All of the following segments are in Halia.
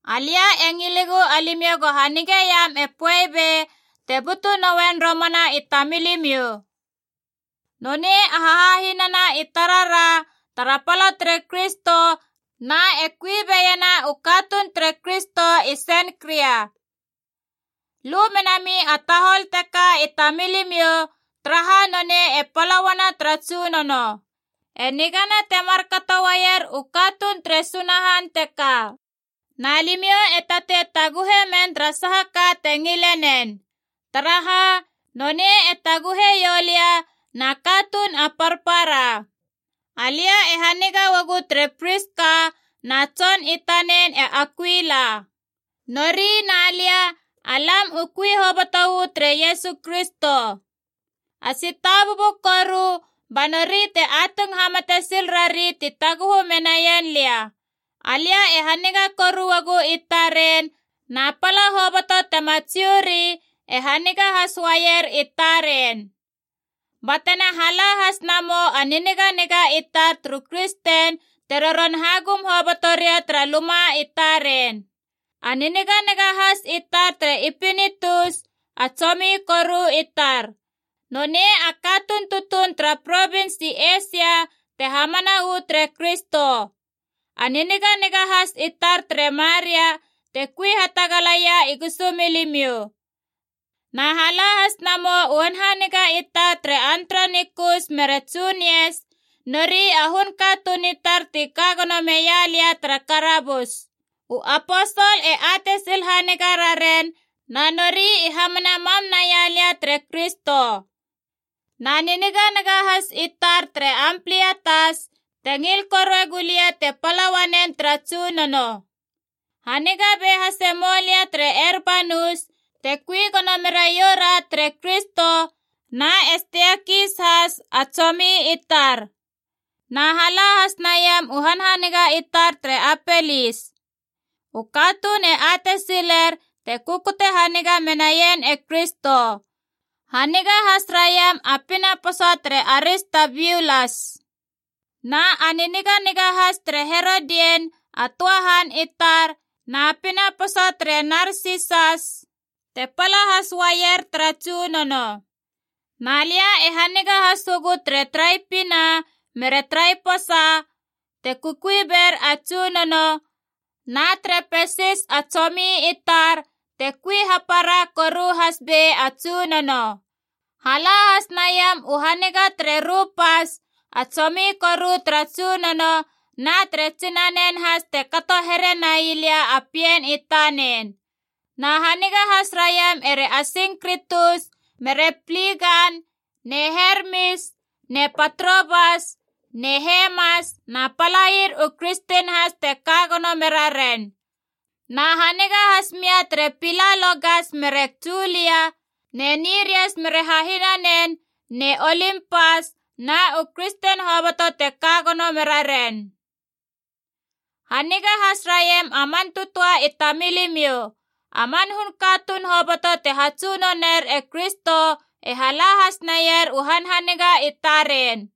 Alia e ngilegu alimiou go hanigeiam e Poebe te butu noen romana i tamilimiou. Nonei a hahahinana i tarara tara pala tere Kristo na e kui beiena u katuun tere Kristo i Senkria. Lu menami a tahol teka i tamilimiou, taraha nonei e pala uana tara Tsunono. E nigana te markato uaier u katuun tere Sunahan teka. Na limiou e tatei taguhe men tara saha ka te ngile nen. Taraha, nonei e taguhe ioulia na katuun a parpara. Alia e haniga uagu tere Priska na tson i tanen e Akuila. Nori na lia, alam u kui hoboto uu tere Iesu Kristo. A tsitabubu koru ba nori te atung hamate sil rari ti taguhu menaien lia. Alia e haniga koru uagu i taren, na pala hoboto tema Jiu ri e haniga has uaier i taren. Batena hala has namou a niniganiga i tar turu kristen te roron hagum hoboto ria tara luma i taren. A niniganiga has i tar tere Epinitus a tsomi koru i tar. Nonei a katuun tutuun tara provins i Eisia te hamana uu tere Kristo. A niniganiga has i tar tere Maria, te kui hatagalaia i gusumilimiou. Na hala has namou u hanhaniga i tar tere Andronikus mere Junias, nori a hun katuun i tar ti ka gono meia lia tara karabus. U aposol e atei sil haniga raren, na nori i hamana mam naia lia tere Kristo. Na niniganiga has i tar tere Amplietas te ngil korue gulia te pala uanen tara Tsunono. Haniga be hase mou lia tere Erbanus te kui gono meraiou ra tere Kristo, na e Steikis has, a tsomi i tar. Na hala has naiam u hanhaniga i tar tere Apelis. U katuun e atei siler te kukute haniga menaien e Kristo. Haniga has raiam a pinaposa tere Aristabiulas. Na a niniganiga has tere Herodian a töa han i tar, na pinaposa tere Narsisas te pala has uaier tara Tsunono. Na lia e haniga has uagu tere Traipina mere Traiposa, te kukui ber a Tsunono, na tere Pesis a tsomi i tar te kui hapara koru has bei a Tsunono. Hala has naiam u haniga tere Rupas, a tsomi koru tara Tsunono, na tere tsinanen has te kato here nai lia a pien i tanen. Na haniga has raiam ere Asingkritus mere Pligan ne Hermis ne Patrobas ne Hermas na palair u kristen has te ka gono mera ren. Na haniga has mia tere Pilalogas mere Julia ne Nirias mere hahinanen ne Olimpas na u kristen hoboto te ka gono mera ren. Haniga has raiam a man tötöa i tamilimiou. A man hun katuun hoboto te hatsunoner e Kristo e hala has naier u hanhaniga i taren.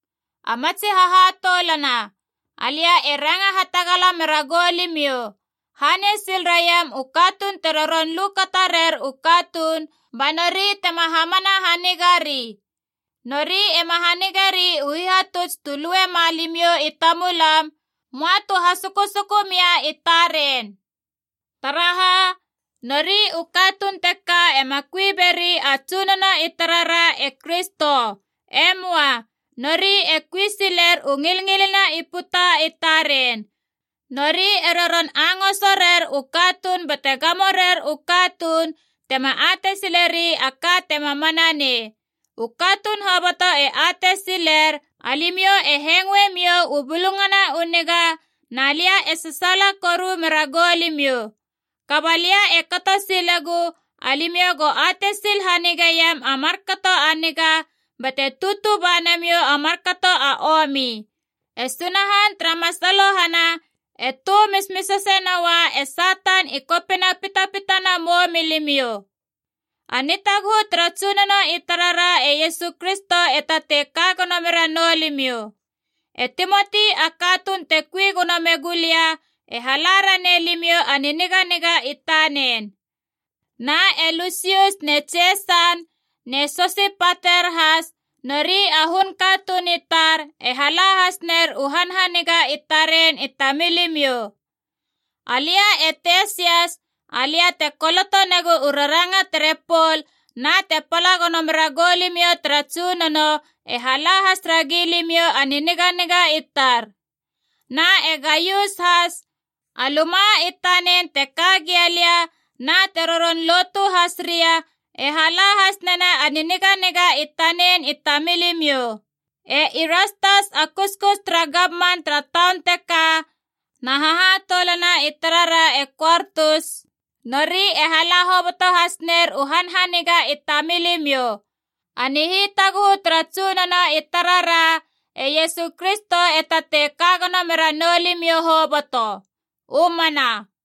A matsi hahatoulana, alia e ranga hatagala mera goulimiou, hanei sil raiam u katuun te roron lu kata rer u katuun ba nori tema hamana hanigari. Nori ema hanigeri u hihatuts tu luema limiou i tamulam, möa tu hasukusuku mia i taren. Taraha, nori u katuun teka ema kui beri a Tsunono i tarara e Kristo. E möa. Nori e kui siler u ngilngilina i puta i taren. Nori e roron angoso rer u katuun bate gamo rer u katuun tema atei sileri a ka tema mana nei. U katuun hoboto e atei siler alimiou e hengoe miou u Bulungana u Niga, na lia e sasaala koru mera goulimiou. Kaba lia e kato silegu alimiou go atei sil hanigeiam a markato a niga bate tutu ba namiou a markato a omi. E Sunahan tara masalohana e tö mismisase noua e Satan i kopina pitapitana mou milimiou. A nihitaguhu tara Tsunono i tarara e Iesu Kristo e tatei ka gono mera noulimiou. E Timoti a katuun te kukui gono megu lia e hala ranei limiou a niniganiga i tanen. Na e Lusius ne Jeson ne Sosipater has, nori a hun katuun i tar, e hala has ner u hanhaniga i taren i tamilimiou. Alia e Tesias, alia te koloto negu u raranga tere Pol na te pala gono mera gou limiou tara Tsunono, e hala has ragi limiou a niniganiga i tar. Na e Gaius has, a luma i tanen te ka gia lia na te roron lotu has ria, e hala has nena a niniganiga i tanen i tamilimiou. E Irastas a kuskus tara gamman tara taun teka na hahatoulana i tarara e Kuortus, nori e hala hoboto has ner a niniganiga i tamilimiou. A nihitaguhu tara Tsunono i tarara e Iesu Kristo e tatei ka gono mera noulimiou hoboto. U mana.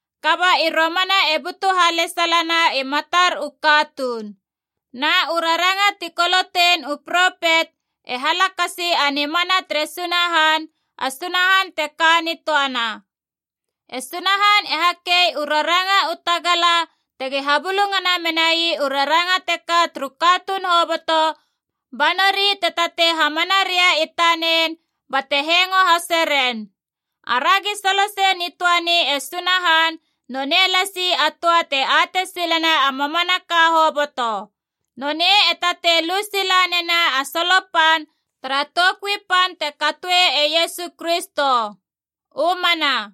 Kaba i romana e butu halesalana i matar u katuun. Na u raranga ti kolotein u propet e halakasi a nimana tere Sunahan, a Sunahan te ka nitöana. E Sunahan e hakei u raranga u tagala tegi habulungana menai u raranga teka turu katuun hoboto, ba nori te tatei hamana ria i tanen bate hengo hase ren. Aragi solosei nitöani e Sunahan nonei lasi a töa te atei silena a mamanaka hoboto. Nonei e tatei lu sila nena a solo pan tara toukui pan te katoe e Iesu Kristo. U mana.